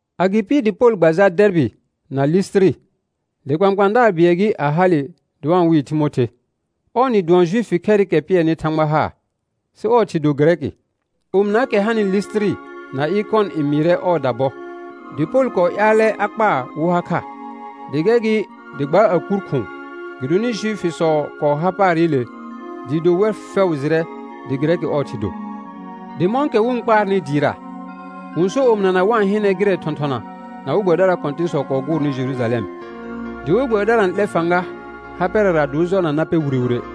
Agɩpɩ dɩ Pol gba jal Dɛɛrbɩ na Lisitiri, dɩ kpãkpãadaar bɩɛl gɩ a hale dɩ wa-n wɩɩ Timothe; ɔɔ nɩ dʋɔn Juifi khɛrɩkɛ pɩɛrnɩ Thãgba haar, sɩ ɔɔ thɩ do Gɩrɛkɩ. Omɩnaakɛ hanɩ Lisitiri na Ɩkɔn n mɩɩrɛ ɔɔda bɔ. Dɩ Pol kɔɔ ƴaalɛ a kpaa wɩ ha kha, dɩ gɛr gɩ dɩ gbaa a kur khʋ̃ʋ, gɩdonɩ Juifisɔ kɔɔ har paarɩle dɩɩ do wɛr fɛʋ jɩrɛ dɩ Gɩrɛkɩ ɔɔ thɩ do. Dɩ mɔ̃kɛ wɩ-n kpaarnɩ dɩɩra, wɩ-n sor omɩnana wa-n hɩnɛ gɩrɛɛkɛ thɔ̃thɔna na we gbɛbɩdaraa kɔ̃tɩ̃sɔ kɔɔ gʋʋrnɩ Jerujalɛm. Dɩ we gbɛbɩdara n 'lɛr fãga ha pɛrɛra dɩ wɩ jɔrna na pɛr wire wire.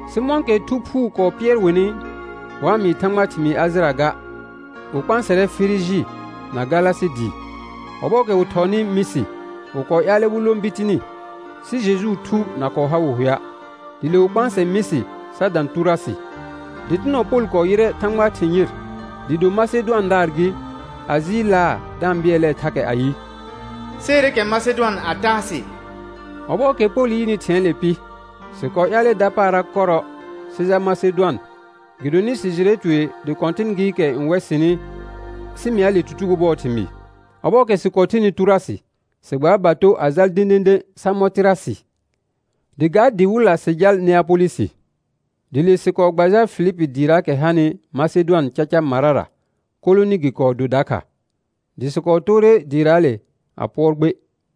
Sɩ mɔ̃kɛ Thu Phuu kɔɔ pɩɛr wɩnɩ wa-n mɩɩ Thãgbaa thɩmɩɩ Ajɩra ga, wɩ kpãasɛrɛ Firiji na Galasɩ dɩɩ. Ɔbɔɔkɛ wɩ thɔɔnɩ Mɩsɩ wɩ kɔɔ ƴaalɛ wɩ lõ Bitini, sɩ Jejuu Thu na kɔɔ ha wɩ hʋɛa'. Dɩ le wɩ kpãsɛ Mɩsɩ sa dã Tʋrʋasɩ. Dɩtɩnɔ Pol kɔɔ yɩrɛ Thãgbaa thɩ̃ yɩr dɩɩ do Masedʋandaar gɩ, a jɩɩlaa da-n bɩɛlɛɛ thakɛ ayɩ: Seere kɛ Masedʋan a taa sɩ. Ɔbɔɔkɛ Pol yɩnɩ thɩ̃ɛɛle pɩ, sɩ kɔɔ ƴaalɛ dapaara kɔrɔ sɩ jal Masedʋan, gɩdonɩ sɩ jɩrɛ tue dɩ Kɔ̃tɩn gɩɩkɛ n wɛ sɩnɩ sɩ mɩa le tutugo bʋɔɔ thɩmɩɩ. Ɔbɔɔkɛ sɩ kɔɔ thenɩ Tʋrʋasɩ, sɩ gbaar bato a jal dẽdẽdẽ Samɔtɩrasɩ, dɩ ga dɩ wɩlla sɩ jal Neapolɩsɩ. Dɩ le sɩ kɔɔ gba jal Eilipi dɩɩraakɛ hanɩ Masedʋan caca marara, kolonɩ gɩ kɔɔ do dakha, dɩ sɩ kɔɔ toore dɩɩraale a pʋɔr gbe.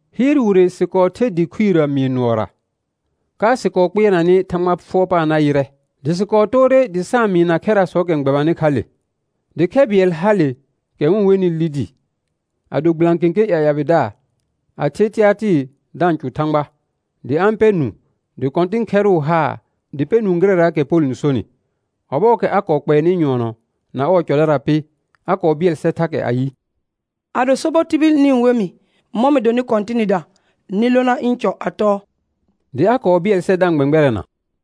Hɩɩr wire sɩ kɔɔ ther dɩ khuirə mɩɩr nʋɔra, ka sɩ kɔɔ kpɩɛrnanɩ Thãgba fʋɔr paar na yɩrɛ. Dɩ sɩ kɔɔ toore dɩ sa-n mɩɩna khɛrasɔɔkɛ n gbɛbanɩ kha le. Dɩ khɛ bɩɛl hale kɛ wɩ-n wenɩ Lidi, a do gbɩlã kẽkẽ ƴaƴabɩdaar, a the Tɩatɩɩr da-n cʋ Thãgba; dɩ a-n pɛr nũu, dɩ Kɔ̃tɩn khɛrʋʋ haar dɩ pɛ nũu gɩrɛraakɛ Pol n sonɩ. Ɔbɔɔkɛ a kɔɔ kpɛɛnɩ nyʋɔnɔ na ɔɔ cɔdara pɩ, a kɔɔ bɩɛl sɛr thakɛ ayɩ: Ado sobɔ tibil nɩ-n we mɩ mɔ̃ mɩ donɩ Kɔ̃tɩnɩda, nɩ lona ɩ̃ cɔ a tɔɔ; dɩ a kɔɔ bɩɛl sɛr da-n gbɛ̃gbɛrɛna.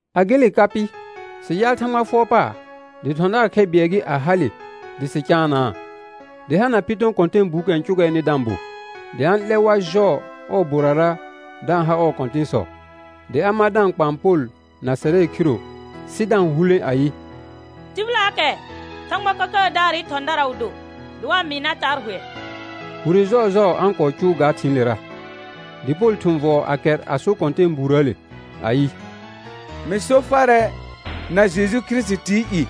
A gele ka pɩ, sɩ jaal Thãgba fʋɔr paar, dɩ thɔ̃daar khɛ bɩɛl gɩ, a hale dɩ sɩ caanaa, dɩ hana Pɩtɔ̃ kɔ̃tɛɛbuukɛ cʋgɛɛnɩ da-n bo, dɩ a-n 'lɛr war jɔɔ ɔɔ borara da-n ha ɔɔ kɔ̃tɩ̃sɔ; dɩ a mar da-n kpaan Pol na sɛrɛ khiro sɩ da-n hulẽ ayɩ: Tɩbɩlaakɛ Thãgba Kəkəədaarɩ thɔ̃dara wɩ do dɩ wa-n mɩɩ nar taa hʋɛ. Wire jɔɔjɔɔ a-n kɔɔ cʋʋ ga thɩ̃ɩlera. Dɩ Pol thʋ̃ vɔɔ a kɛr a so kɔ̃tɛɛbuurəəle ayɩ: Mɩ so farɛ na Jeju Kirisitii i,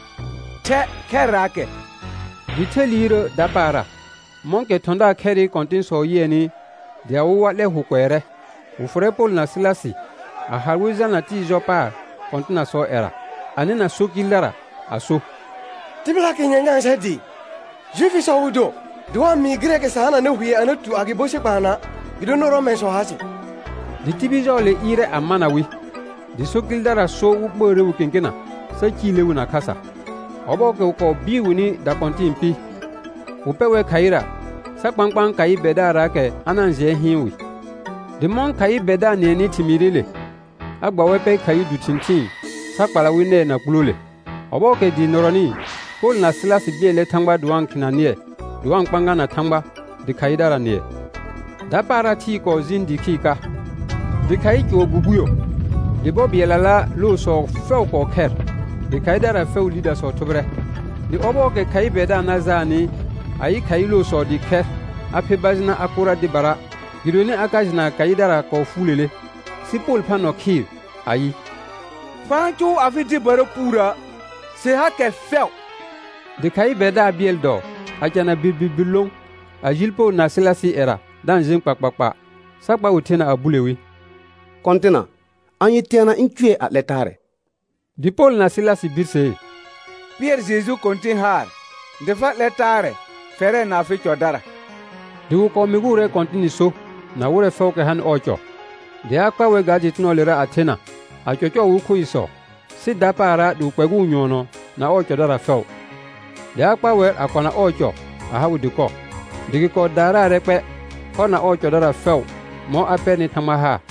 thɛ khɛrraakɛ. Dɩ the liirrəə dapaara. Mɔ̃kɛ thɔ̃daar khɛrɩ kɔ̃tɩ̃sɔ yɩɛnɩ dɩ awɩ war 'lɛ hʋ kʋɛrɛ, wɩ fʋrɛ Pol na Sɩlasɩ a hal wɩ jalna tɩɩ jɔ paar kɔ̃tɩnasɔɔ ƴɛra, a nɩna so kɩɩldara a so: Tɩbɩlaakɛ nyanyãa sɛr dɩɩ; Juifisɔ wɩ do dɩ wa-n mɩɩ gɩrɛɛkɛ sa hananɩ hʋɛ a na tu agɩbo sɩ kpaanɔa', gɩdonɩ Rɔmɛ̃sɔ ha sɩ. Dɩ tibil jɔɔle ɩɩrɛ a mana wɩ, dɩ so kɩɩldara so wɩ ɓəəre wi kẽkena sa cile wi na khasa. Ɔbɔɔkɛ wɩ kɔɔ bɩɩr wɩnɩ dakɔ̃tɩ̃ɩ pɩ, wɩ pɛ wɛr khaɩra sa kpãkpãa khaɩ bɛrdaarraakɛ a na-n jɩɛ hɩɩn wɩ. Dɩ mɔ̃ khaɩ bɛrdaar nɩɛnɩ thɩmɩɩrɩle, a gba wɛr pɛ khaɩ du thɩ̃thɩɩn sa kpala wɩ nɛɛ na kpulole. Ɔbɔɔkɛ dɩɩ nɩrɔnɩ, Pol na Sɩlasɩ bɩɛlɛ Thãgba dɩ wa-n khɩna nɩɛ dɩ wa-n kpãgana Thãgba, dɩ khaɩdara nɩɛ. Dapaara thɩɩ kɔɔ jɩɩn dɩɩ khɩɩr ka, dɩ khaɩ cʋɔr gbugbuyo; dɩ bɔ bɩɛllala loosɔ fɛʋ kɔɔ khɛr, dɩ khaɩdara fɛʋʋ lidasɔ thʋbɩrɛ. Dɩ ɔbɔɔkɛ khaɩ bɛrdaar na jaanɩ a yɩ khaɩ loosɔ dɩɩ khɛr, a pher bajɩna a kʋra dɩbara gɩdonɩ a ka jɩna khaɩdara kɔɔ fuulele. Sɩ Pol phã nɔ khɩɩr ayɩ: Fa-n cʋʋ afɩ dɩbara puurə', sɩ hakɛ fɛʋ. Dɩ khaɩ bɛrdaar bɩɛl dɔɔ a cana birbirbir lõ, a ji Pol na Sɩlasɩɩ ƴɛra da n jẽ kpakpakpa, sa kpa wɩ thena a bule wi: Kɔ̃tɩna, anye teana ĩ cʋɛ a 'lɛ taarɛ? Dɩ Pol na Sɩlasɩ birsee: Pɩɛr Jeju Kɔ̃tɩn haar dɩ fa 'lɛr taarɛ, fɛrɛ na afɩ cɔdara. Dɩ wɩ kɔɔ mɩgʋʋrɛ Kɔ̃tɩnɩ so na wɩrɛ fɛʋʋkɛ hanɩ ɔɔ cɔ. Dɩ a kpa wɛr ga dɩtɩnɔɔlera a thena a cɔcɔɔ wɩ khoisɔ, sɩ dapaara dɩ wɩ kpɛgʋʋ nyʋɔnɔ na ɔɔ cɔdara fɛʋ. Dɩ a kpa wɛr a kɔna ɔɔ cɔ a ha wɩ dɩkɔ, dɩ gɩ kɔɔ daaraarɛ kpɛ ɔr na ɔɔ cɔdara fɛʋ mɔ̃ a pɛrnɩ Thãgba haar.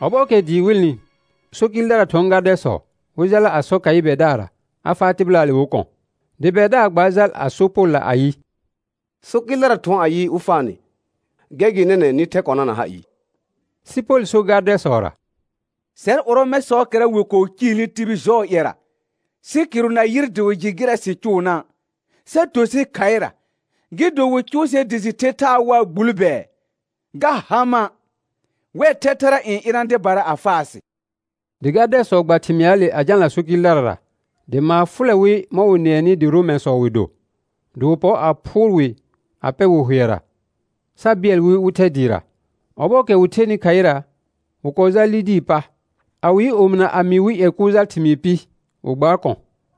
Ɔbɔɔkɛ dɩɩ wɩlnɩ, so kɩɩldara thʋɔn gardɛsɔ wɩ jala a sɔ khaɩ bɛrdaarra a faa tɩbɩlaale wɩ kɔ̃. Dɩ bɛrdaar gbaar jal a so Polla ayɩ: So kɩɩldara thʋɔn ayɩ, wɩ faa nɩ; gɛr gɩ nɛnɛ̃ nɩ thɛ kɔna na ha ɩɩ. Sɩ Pol so gardɛsɔra: Sɛr Rɔmɛ̃sɔɔkɛra wɩ kɔɔ ciilni tibil jɔɔ ƴɛra, sɩ kɩrʋ na yɩr dɩ wɩ jɩ gɩrɛ sɩ cʋʋna', sa to sɩ khaɩra, gɩ do wɩ cʋʋ sɛr dɩ sɩ the thaa waa gbul bɛɛ? Ga ha mã'. Wɛr thɛthɛra n ɩna dɩbara a faa sɩ. Dɩ gardɛsɔ gba thɩmɩaale a jalna so kɩɩldarara, dɩ maar fʋlɛ wɩ mɔ̃ wɩ nɩɛnɩ dɩ Rɔmɛ̃sɔ wɩ do. Dɩ wɩ pɔr a phʋʋr wɩ a pɛ wɩ hʋɛra, sa bɩɛl wɩ wɩ thɛ dɩɩra. Ɔbɔɔkɛ wɩ thenɩ khaɩra wɩ kɔɔ jaal Lidii pa. A wɩ yɩ omɩna a mɩɩ wɩ ƴɛ kʋʋl jal thɩmɩɩr pɩ, wɩ gbaar kɔ̃.